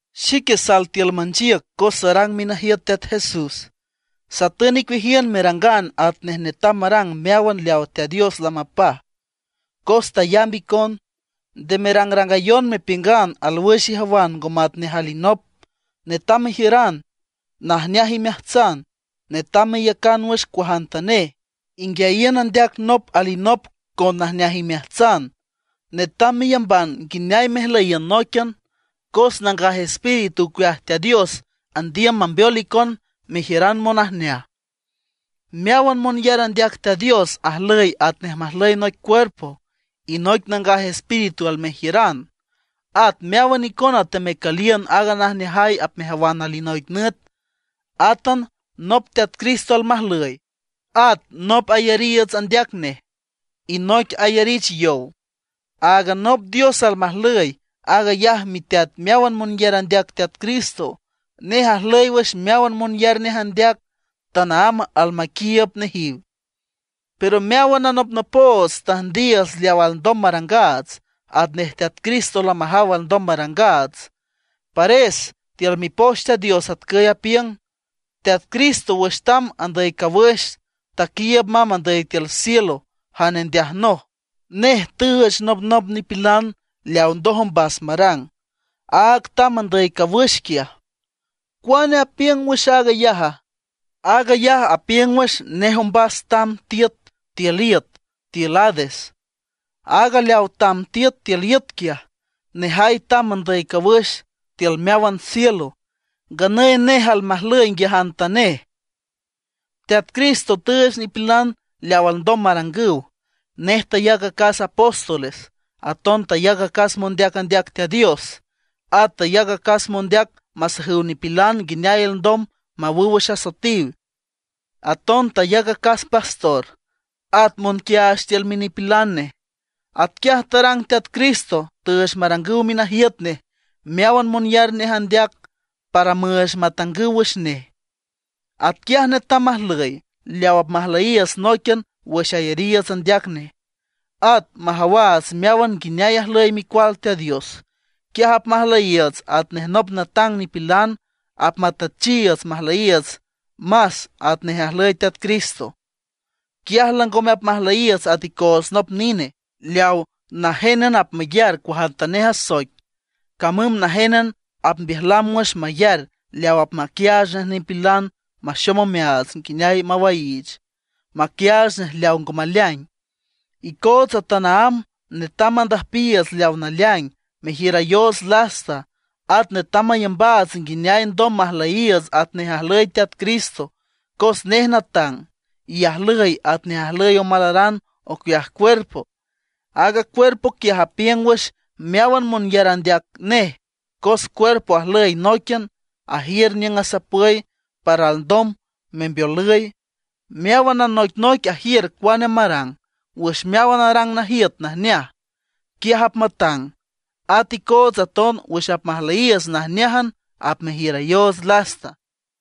Xique sal tiül manchiüc cos sarang minajiüt Teat Jesús. Satün icueajiün merangan atnej netam marang meáwan leawa Teat Dios lamapaj, cos tayamb icon. Nde merangrangayon mepiüngan alwüx ijawan ngo matnej alinop. Netam mejiüran najneaj imeajtsan; netam meiücan wüx cuajantanej, inguiayiün andeac nop alinop con najneajay imeajtsan. Netam meyamban nguineay mejlüyiün nóiquian, cos Nangaj Espíritu ocueaj Teat Dios andiüm mambeol icon mejiüran monajneaj. Meáwan monyar andeac Teat Dios ajlüy atnej majlüy noic cuerpo, y noic Nangaj Espíritu almejiüran. At meáwan icona temecüliün aaga najneajay apmejawan alinoic nüt. Átan nop Teat Cristo almajlüy, at nop ayariiüts andeac nej, y noic ayarich yow. Áagan nop Dios almajlüy, aag ayaj miteat meáwan monyar andeac Teat Cristo. Nej ajlüy wüx meáwan monyar nej andeac, tanaámb almaquiiüb nejiw. Pero meáwan anopnopoots tüjndiiüts leaw alndom marangaats, atnej Teat Cristo lamajaw alndom marangaats. Pares, tiül Mipoch Teat Dios atcüy apiüng: Teat Cristo wüx tamb andüy cawüx, taquiiüb mamb andüy tiül cielo jane ndeajnoj, nej tüüch nopnop nipilan leaw ndoj ombas marang. Aaga tamb andüy cawüx quiaj, ¿cuane apiüng wüx aag ayaja? Aag ayaj apiüng wüx nej ombas tamb tiüt tiül iüt (Hades). Aaga leawa tamb tiüt tiül iüt quiaj, nejay tamb andüy cawüx tiül meáwan cielo; nganüy nej almajlüy nguiajantanej. Teat Cristo tüüch nipilan leaw alndom marangüw. Nej tayac acas apóstoles, aton tayac acas mondeac andeac Teat Dios, at tayac acas mondeac masajüw nipilan nguineay alndom mawüw wüx asoetiw. Aton tayac acas pastor, at monquiaach tiül minipilan nej. Atquiaj tarang Teat Cristo, tüüch marangüw minajiüt nej meáwan monyar nej andeac, para müüch matangüw wüx nej. Atquiaj netam majlüy, leaw apmajlüyiiüts nóiquian wüx ayariiüts andeac nej, at majawaats meáwan nguineay ajlüy Micual Teat Dios. Quiaj apmajlüyiiüts atnej nop natang nipilan; apmatüchiiüts majlüyiiüts más atnej ajlüy Teat Cristo. Quiaj langome apmajlüyiiüts at icoots nop nine, leaw najénan apmayar cuajantanej asoic, camüm najénan apmbiüjlam wüx mayar leaw apmaquiaach nej nipilan monxom omeaats nguineay mawaiich, maquiaach nej leaw ngo maleaing. Icootsa tanaámb netam mandüjpiiüts leawa naleaing, mejiürayoots lasta. At netam mayambaats nguineay alndom majlüyiiüts atnej ajlüy Teat Cristo, cos nej natang, y ajlüy atnej ajlüy omalaran ocueaj cuerpo. Aaga cuerpo quiaj apiüng wüx meáwan monyar andeac nej cos cuerpo ajlüy nóiquian, ajiür niüng asapüy para alndom membeolüy, meáwan anoicnoic ajiür cuane marang. Wüx meáwan arang najiüt najneaj, quiaj apmatang. At icootsa aton wüx apmajlüyiiüts najneájan apmejiürayoots lasta.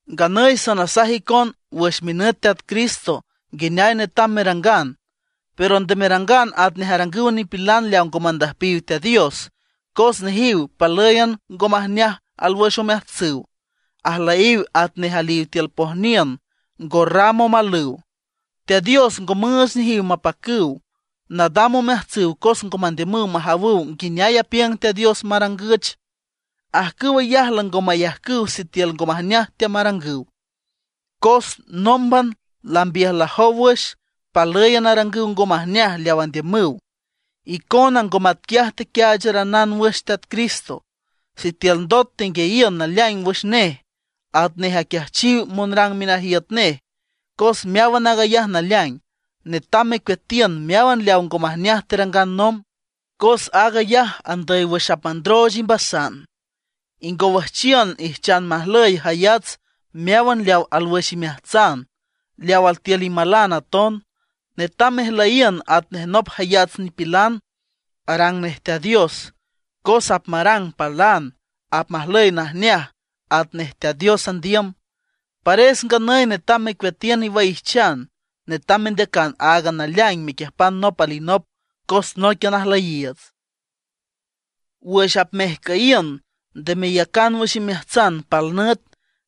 Nganüy sanasaj icon wüx minüt Teat Cristo nguineay netam merangan. Pero nde merangan atnej arangüw nipilan leaw ngo mandüjpiw Teat Dios, cos nejiw palǘyan ngo majneaj alwüx omeajtsüw. Ajlüyiw atnej aliw tiül pojniün, ngo ram omalüw; Teat Dios ngo müüch nejiw mapacüw. Nadam omeajtsüw cos ngo mandiümüw majawüw nguineay apiüng Teat Dios marangüch. Ajcüw ayaj lango mayajcüw sitiül ngo majneaj teamarangüw, cos nómban lambiüjlajow wüx, palǘyan arangüw ngo majneaj leaw andiümüw. Icona ngo matquiaj tequiaacharanan wüx Teat Cristo, sitiül ndot tenguiayiün naleaing wüx nej, atnej aquiajchiw monrang minajiüt nej, cos meáwan aag ayaj naleaing. Netam mecueatiün meáwan leaw ngo majneaj terangan nomb, cos aag ayaj andüy wüx apmandrooch imbasan. Ingowüjchiün ijchan majlüy jayats meáwan leaw alwüx imeajtsan, leaw altiül imalan aton. Netam mejlüyiün atnej nop jayats nipilan, arang nej Teat Dios; cos apmarang palan, apmajlüy najneaj atnej Teat Dios andiüm. Pares nganüy netam mecueatiün iwaijchan, netam mendeacan áagan naleaing mequiüjpan nop alinop, cos nóiquian ajlüyiiüts. Wüx apmejcüyiün nde meyacan wüx imeajtsan pal nüt,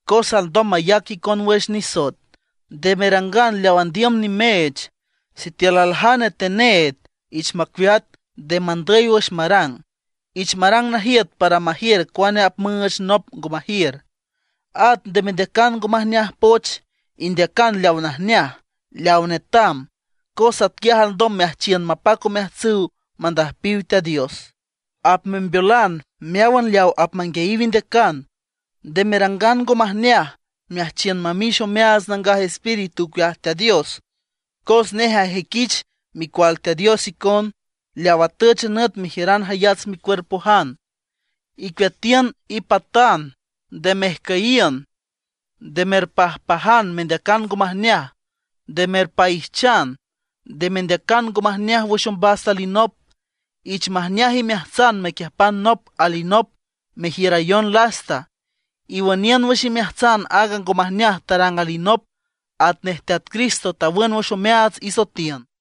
cos alndom mayac icon wüx nisoet. Nde merangan leaw andiüm nimeech. Sitiül aljane teneed, ich macueat, nde mandüy wüx marang; ich marang najiüt para majiür cuane apmüüch nop ngo majiür. At nde mendeacan ngo majneaj poch, indeacan leaw najneaj, leaw netam, cos atquiaj alndom meajchiün mapac omeajtsüw mandüjpiw Teat Dios. Apmembeolan meáwan leaw apmanguiayiw indeacan. Nde merangan ngo majneaj meajchiün mamix omeaats Nangaj Espíritu ocueaj Teat Dios, cos nej ajüiquich micual Teat Dios icon, leaw atüch a nüt mejiüran jayats micuerpojan. Icueatiün ipatan, nde mejcüyiün, nde merpajpajan mendeacan ngo majneaj, nde merpaijchan, nde mendeacan ngo majneaj wüx ombas alinop. Ich majneaj imeajtsan mequiüjpan nop alinop, merjiürayon lasta; iwüniün wüx imeajtsan aaga ngo majneaj tarang alinop, atnej Teat Cristo tawün wüx omeaats isoetiün.